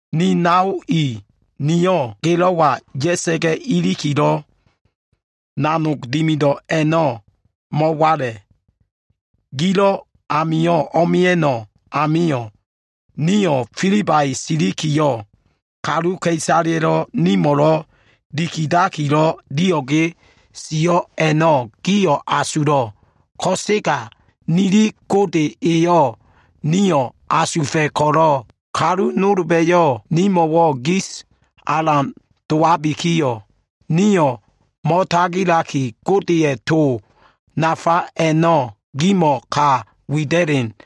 Ni nao i, nio꞉ gelo꞉wa ya꞉sa꞉ga꞉ ilikilo꞉ nanog dimido꞉ a꞉no꞉ mo꞉wala꞉. Gilo꞉ amio꞉ o꞉mia꞉no꞉ amio꞉, nio꞉ Filibai silikiyo꞉, kaluka꞉isaleya꞉lo꞉ nimo꞉lo꞉ dikidiakilo꞉ dio꞉ge sio꞉ a꞉no꞉ gio꞉ asulo꞉. Ko꞉sega nili Gode eyo꞉ nio꞉ asufa꞉ ko꞉lo꞉, kalu nolba꞉yo꞉ nimo꞉wo꞉ giso꞉ alan dowabikiyo꞉, nio꞉ mo꞉tagilaki Godeya꞉ to nafa a꞉no꞉ gimo꞉wo꞉ ka wida꞉len.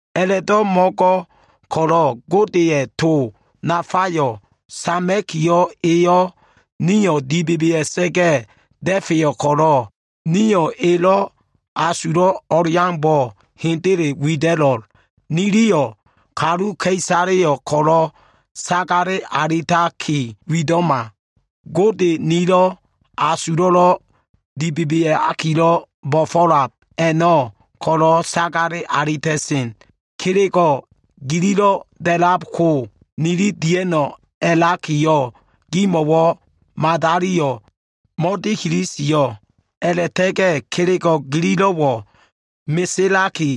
A꞉la꞉bo꞉ mo꞉dimido꞉l. Godeya꞉ to nafayo꞉ sama꞉kiyo꞉, eyo꞉ nio꞉ dibebea꞉sa꞉ga꞉ da꞉feyo꞉ ko꞉lo꞉, niliyo꞉ elo꞉ asulo꞉ o꞉leaumbo꞉ hendele wida꞉lo꞉l. Niliyo꞉ kaluka꞉isaleyo꞉ ko꞉lo꞉ sagale alitaki wido꞉ma. Gode nili asulo꞉lo꞉ dibebeakilo꞉ bo꞉fo꞉lab a꞉no꞉ ko꞉lo꞉ sagale alita꞉sen. Kelego꞉ gililo꞉ da꞉labko nili diano꞉ a꞉lakiyo꞉, gimo꞉wo꞉ madaliyo꞉ mo꞉dikili sio꞉. A꞉la꞉ta꞉ga꞉ kelego꞉ gililo꞉wo꞉ meselaki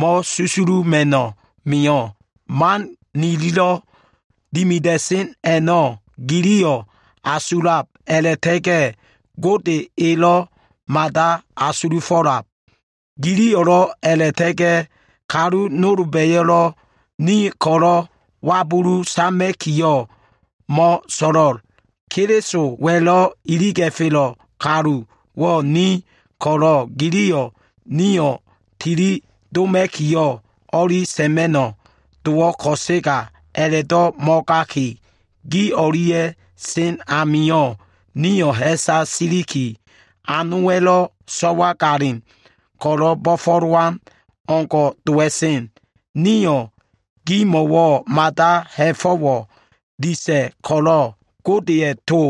mo꞉susuluma꞉ mio꞉. Man nililo꞉ dimida꞉sen a꞉no꞉ giliyo꞉ asulab a꞉la꞉ta꞉ga꞉, Gode elo꞉ mada asulufo꞉lab. Giliyo꞉lo꞉ a꞉la꞉ta꞉ga꞉ kalu nolba꞉yo꞉lo꞉ nio꞉ ko꞉lo꞉ wabulu sama꞉kiyo꞉ mo꞉so꞉lo꞉l. Kelisowa꞉lo꞉ iliga꞉felo꞉ kaluwo꞉ ni ko꞉lo꞉, giliyo꞉ nio꞉ tili doma꞉kiyo꞉ o꞉li sa꞉ma꞉no꞉ dowo꞉ ko꞉sega, a꞉la꞉do꞉ mo꞉gaki, gi o꞉lia꞉ sen amio꞉ nio꞉ ha꞉sa siliki, anowa꞉lo꞉ so꞉wagalin ko꞉lo꞉ bo꞉fo꞉lowan o꞉ngo꞉ dowa꞉sen. Nio꞉ gimo꞉wo꞉ mada ha꞉fo꞉wo꞉ disa꞉ ko꞉lo꞉, Godeya꞉ to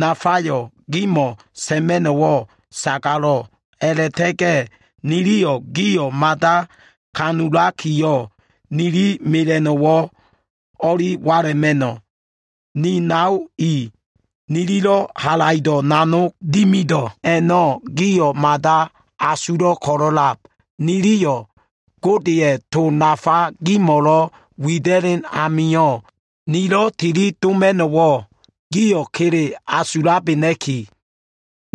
nafayo꞉ gimo꞉ sa꞉ma꞉no꞉wo꞉ sagalo꞉. A꞉la꞉ta꞉ga꞉ niliyo꞉ gimo꞉wo꞉ mada alan asulakiyo꞉, ninin mela꞉no꞉wo꞉ o꞉li wala꞉ma꞉no꞉. Ni nao i, nililo꞉ halaido꞉ nanog dimido꞉ a꞉no꞉ gio꞉ mada asulo꞉ ko꞉lo꞉lab. Niliyo꞉ Godeya꞉ to nafa gimo꞉lo꞉ wida꞉len amio꞉, nilo꞉ tili doma꞉no꞉wo꞉ gio꞉ kele asulabena꞉kiyo꞉,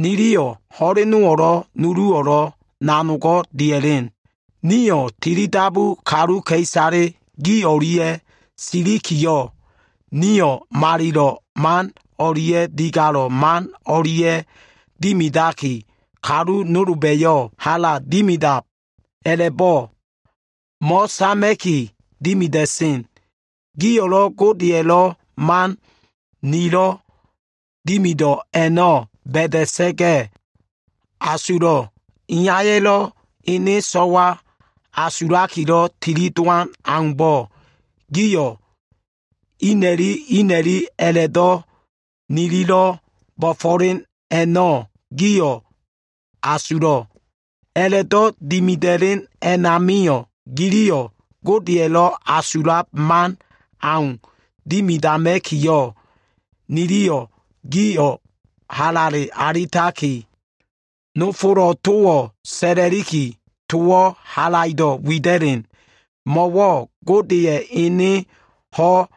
niliyo꞉ ho꞉lenowo꞉lo꞉, nuluwo꞉lo꞉ nanogo꞉ dia꞉len. Nio꞉ tilidabu kaluka꞉isale gi o꞉lia꞉ silikiyo꞉, nio꞉ malilo꞉ man o꞉lia꞉ digalo꞉ man o꞉lia꞉ dimidaki, kalu nolba꞉yo꞉ hala dimido꞉ a꞉la꞉bo꞉ mo꞉sama꞉ki dimida꞉sen. Gio꞉lo꞉ Godeya꞉lo꞉ man nilo꞉ dimido꞉ a꞉no꞉ ba꞉da꞉sa꞉ga꞉ asulo꞉. Iyaya꞉lo꞉ ene so꞉wa asulakilo꞉ tilidowan aumbo꞉, gio꞉ ina꞉li ina꞉li a꞉la꞉do꞉ nililo꞉ bo꞉fo꞉len a꞉no꞉ gio꞉ asulo꞉. A꞉la꞉do꞉ dimida꞉len a꞉namio꞉, giliyo꞉ Godeya꞉lo꞉ asulab man au dimidama꞉kiyo꞉, niliyo꞉ gio꞉ halale alitaki, nofolo꞉ towo꞉ sa꞉la꞉liki, towo꞉ halaido꞉ wida꞉len. Mo꞉wo꞉ Godeya꞉ ene ho꞉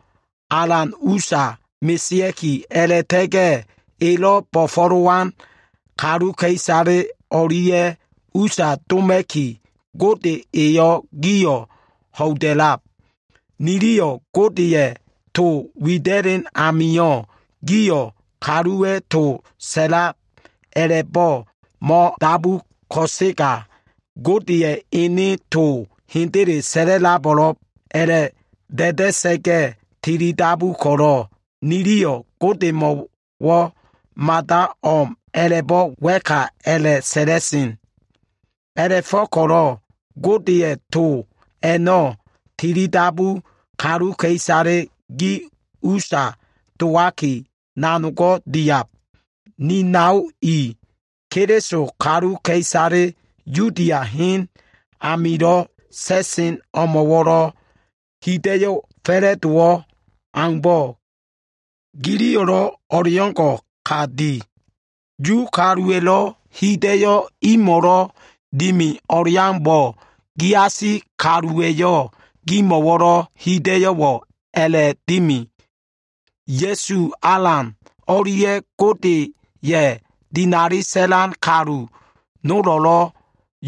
alan usa mesea꞉ki a꞉la꞉ta꞉ga꞉, Elo꞉ bo꞉fo꞉lowan kaluka꞉isale o꞉lia꞉ usa doma꞉ki, Gode Eyo꞉ gio꞉ ho꞉ida꞉lab. Niliyo꞉ Godeya꞉ to wida꞉len amio꞉, gio꞉ kaluwa꞉ to sa꞉lab a꞉la꞉bo꞉ mo꞉dabu ko꞉sega, Godeya꞉ ene to hendele sa꞉labo꞉lo꞉b a꞉la꞉ da꞉da꞉sa꞉ga꞉ tilidabu ko꞉lo꞉, niliyo꞉ Godemo꞉wo꞉ mada o꞉m a꞉la꞉bo꞉ wa꞉ka a꞉la꞉sa꞉la꞉len. A꞉la꞉fo꞉ko꞉lo꞉ Godeya꞉ to a꞉no꞉, tilidabu kaluka꞉isale gi usa dowaki, nanogo꞉ diab. Ni nao i, Keliso kaluka꞉isale Yudia hen amilo꞉ sa꞉sen ilo꞉ amilo꞉ hida꞉yo꞉ fa꞉la꞉dowo꞉ aumbo꞉, giliyo꞉lo꞉ o꞉leo꞉ngo꞉ ka di. Yu kaluwa꞉lo꞉ hida꞉yo꞉ imo꞉lo꞉ dimi o꞉leaumbo꞉, giasi kaluwa꞉yo꞉ gimo꞉wo꞉lo꞉ hida꞉yo꞉wo꞉ a꞉la꞉dimi. Ya꞉su Alan o꞉lia꞉ Godeya꞉ dinali sa꞉lan kalu nolo꞉lo꞉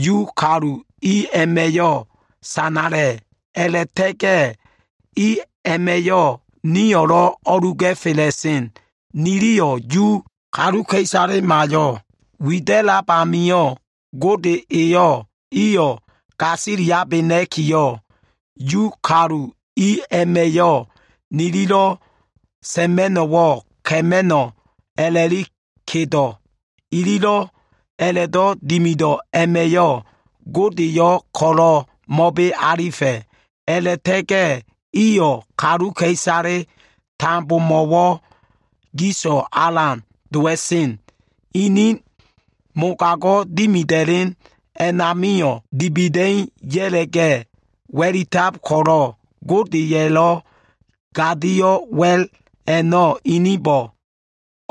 Yu kalu i a꞉ma꞉yo꞉ sanala꞉. A꞉la꞉ta꞉ga꞉ i a꞉ma꞉yo꞉ nio꞉lo꞉ o꞉lu ga꞉fela꞉sen. Niliyo꞉ Yu kaluka꞉isalema a꞉no꞉ wida꞉lab amio꞉, Gode eyo꞉ iyo꞉ gasiliabena꞉kiyo꞉, Yu kalu i a꞉ma꞉yo꞉ nililo꞉ sa꞉ma꞉no꞉wo꞉ ka꞉ma꞉no꞉ a꞉la꞉li kedo꞉. Ililo꞉ a꞉la꞉do꞉ dimido꞉ a꞉ma꞉yo꞉ Godeyo꞉ ko꞉lo꞉ mo꞉be alifa꞉, a꞉la꞉ta꞉ga꞉ iyo꞉ kaluka꞉isale tambomo꞉wo꞉ giso꞉ alan dowa꞉sen. Inin mogago꞉ dimida꞉len a꞉namio꞉, dibida꞉i ya꞉la꞉ga꞉ wa꞉litab ko꞉lo꞉, Godeya꞉lo꞉ gadio꞉ wa꞉l a꞉no꞉ inibo꞉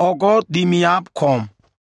o꞉go꞉ dimiab ko꞉m.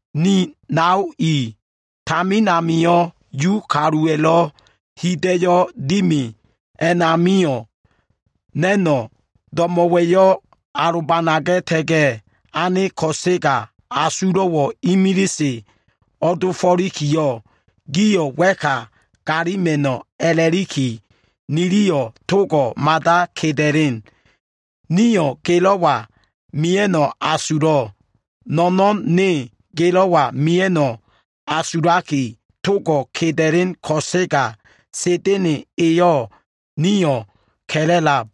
Ni nao i, tamin amio꞉ Yu kaluwa꞉lo꞉ hida꞉yo꞉ dimi a꞉namio꞉, na꞉no꞉ do꞉mo꞉wa꞉yo꞉ alobanaga꞉ta꞉ga꞉ ane ko꞉sega, asulo꞉wo꞉ imilise o꞉dofo꞉likiyo꞉, gio꞉ wa꞉ka galima꞉no꞉ a꞉la꞉liki, niliyo꞉ togo꞉ mada keda꞉len. Nio꞉ gelo꞉wa mia꞉no꞉ asulo꞉. Fo꞉l ne gelo꞉wa mia꞉no꞉ asulaki togo꞉ keda꞉len ko꞉sega, Sa꞉da꞉na꞉ eyo꞉ nio꞉ ka꞉la꞉lab.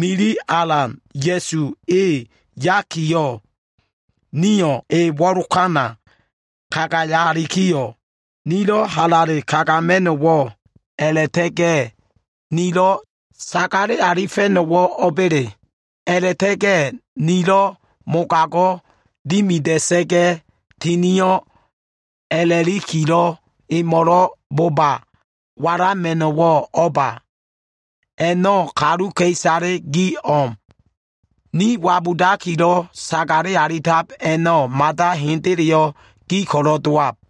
Nili Alan Ya꞉su e yaliki, nio꞉ e wo꞉lokana kagayalikiyo꞉, nilo꞉ halale kagama꞉no꞉wo꞉, a꞉la꞉ta꞉ga꞉ nilo꞉ sagale alifa꞉no꞉wo꞉ o꞉ba꞉le? A꞉la꞉ta꞉ga꞉ nilo꞉ nanogo꞉ dimida꞉sa꞉ga꞉ tinio꞉ a꞉la꞉likilo꞉ emo꞉lo꞉ boba walama꞉no꞉wo꞉ o꞉ba? A꞉no꞉ kaluka꞉isale gi o꞉m. Ni wabudakilo꞉ sagale alitab a꞉no꞉, mada hendeleyo꞉ gi ko꞉lo꞉ dowab.